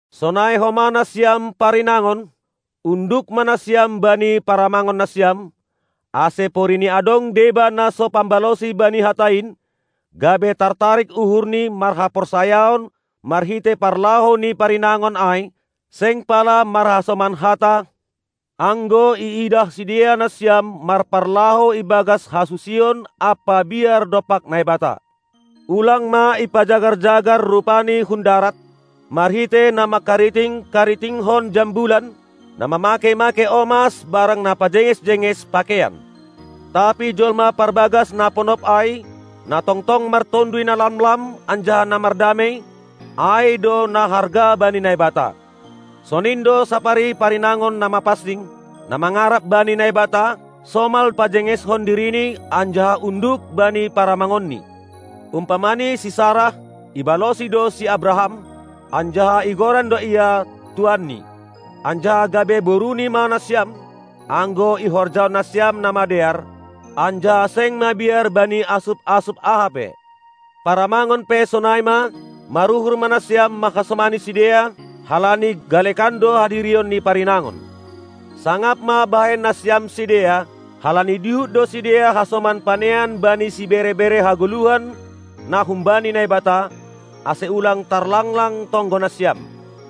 Sonai homa nasiam parinangon, unduk ma nasiam bani paramangon nasiam, ase porini adong deba na so pambalosi bani Hata in, gabe tartarik uhurni marhaporsayaon marhitei parlahou ni parinangon ai, seng pala marhasoman hata, anggo iidah sidea nasiam marparlahou ibagas hasusion ampa biar dompak Naibata. Ulang ma ipajagar-jagar rupani hun darat, marhitei na mangkariting-karitingkon jambulan, na mamakei-makei omas barang na pajenges-jenges pakeian. Tapi jolma parbagas na ponop ai, na tongtong martonduy na lamlam anjaha na mardamei, ai do na harga bani Naibata. Sonin do sapari parinangon na mapansing, na mangarap bani Naibata, somal pajengeshon dirini anjaha unduk bani paramangonni. Umpamani si Sarah, ibalosi do si Abraham, anjaha igoran do ia "tuanni". Anjaha gabe boruni ma nasiam, anggo ihorjahon nasiam na madear, anjaha seng mabiar bani asup-asup aha pe. Paramangon pe sonai ma, maruhur ma nasiam manghasomani sidea, halani galekan do hadirion ni parinangon. Sangap ma bahen nasiam sidea, halani dihut do sidea hasoman panean bani sibere-bere hagoluhan na humbani Naibata, ase ulang tarlanglang tonggo nasiam.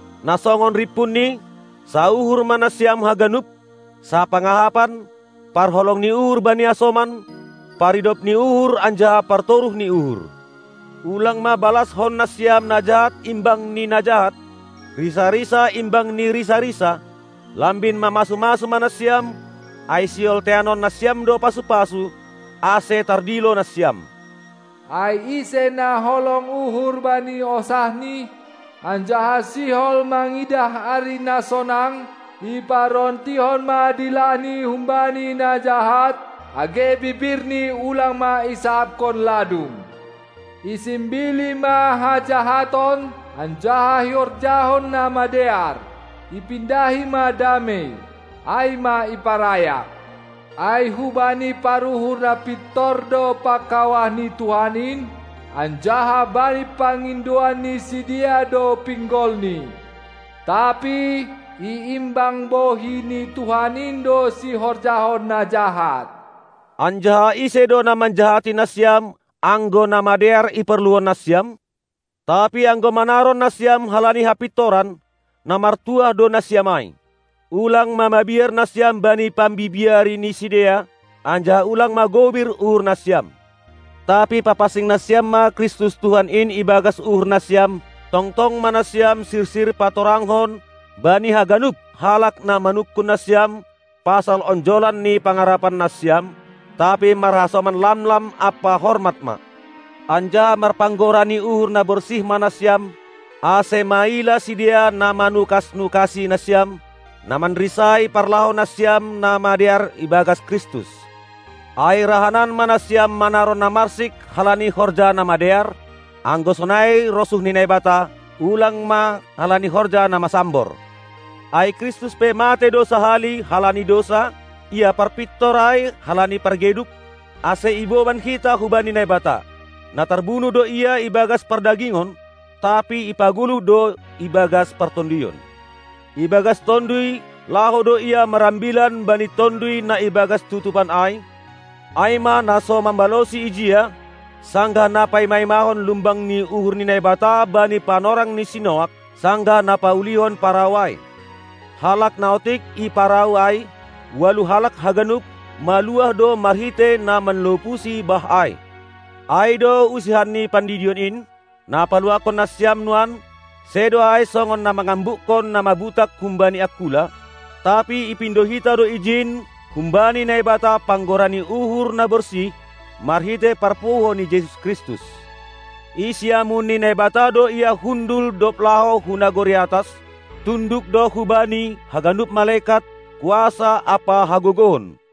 Na songon rimpunni: Sauhur ma nasiam haganup, sapangahapan, parholong ni uhur bani hasoman, paridop ni uhur anjaha partoruh ni uhur. Ulang ma balaskon nasiam na jahat imbang ni na jahat, risa-risa imbang ni risa-risa; lambin mamasu-masu ma nasiam, ai sihol teanon nasiam do pasu-pasu, ase tardilo nasiam. Ai ise na holong uhur bani hosahni, anjaha sihol mangidah ari na sonang, iparontihon ma dilahni humbani na jahat, age bibirni ulang ma isahapkon ladung. Isimbili ma hajahaton anjaha ihorjahon na madear; ipindahi ma damei, ai ma iparayak. Ai hubani paruhur na pintor do pangkawah ni Tuhan in, anjaha bani pangindoan ni sidea do pinggolni; tapi iimbang bohi ni Tuhan in do sihorjahon na jahat. Anjaha ise do na manjahati nasiam, anggo na madear iporluhon nasiam? Tapi anggo manaron nasiam halani hapintoran, na martuah do nasiam ai. Ulang ma mabiar nasiam bani pambibiari ni sidea, anjaha ulang ma gobir uhur nasiam. Tapi papansing nasiam ma Kristus Tuhan in ibagas uhur nasiam, tongtong ma nasiam sirsir patorangkon bani haganup halak na manungkun nasiam pasal onjolan ni pangarapan nasiam, tapi marhasoman lamlam ampa hormat ma. Anjaha marpanggora ni uhur na borsih ma nasiam, ase maila sidea na manukas-nukasi nasiam, na manrisai parlahou nasiam na madear ibagas Kristus. Ai rahanan ma nasiam manaron na marsik halani horja na madear, anggo sonai rosuh ni Naibata, ulang ma halani horja na masambor. Ai Kristus pe matei do sahali halani dousa, Ia parpintor ai halani pargeduk, ase iboban hita hubani Naibata. Na tarbunuh do Ia ibagas pardagingon, tapi ipagoluh do ibagas partonduyon. Ibagas tonduy laho do Ia marambilan bani tonduy na ibagas tutupan ai, ai ma na so mambalosi ijia, sanggah na paima-imahon lumbang ni uhur ni Naibata bani panorang ni si Noak, sanggah na paulihon parau ai. Halak na otik i parau ai, ualuh halak haganup, maluah do marhitei na manlopusi bah ai. Ai do usihan ni pandidion in, na paluahkon nasiam nuan: sedo ai songon na mangambukkon na mabutak humbani angkula, tapi ipindo hita do ijin humbani Naibata panggora ni uhur na borsih, marhitei parpuho ni Jesus Kristus. I siamun ni Naibata do Ia hundul dob laho hu nagori atas; tunduk do hu Bani haganup malekat, kuasa ampa hagogohon.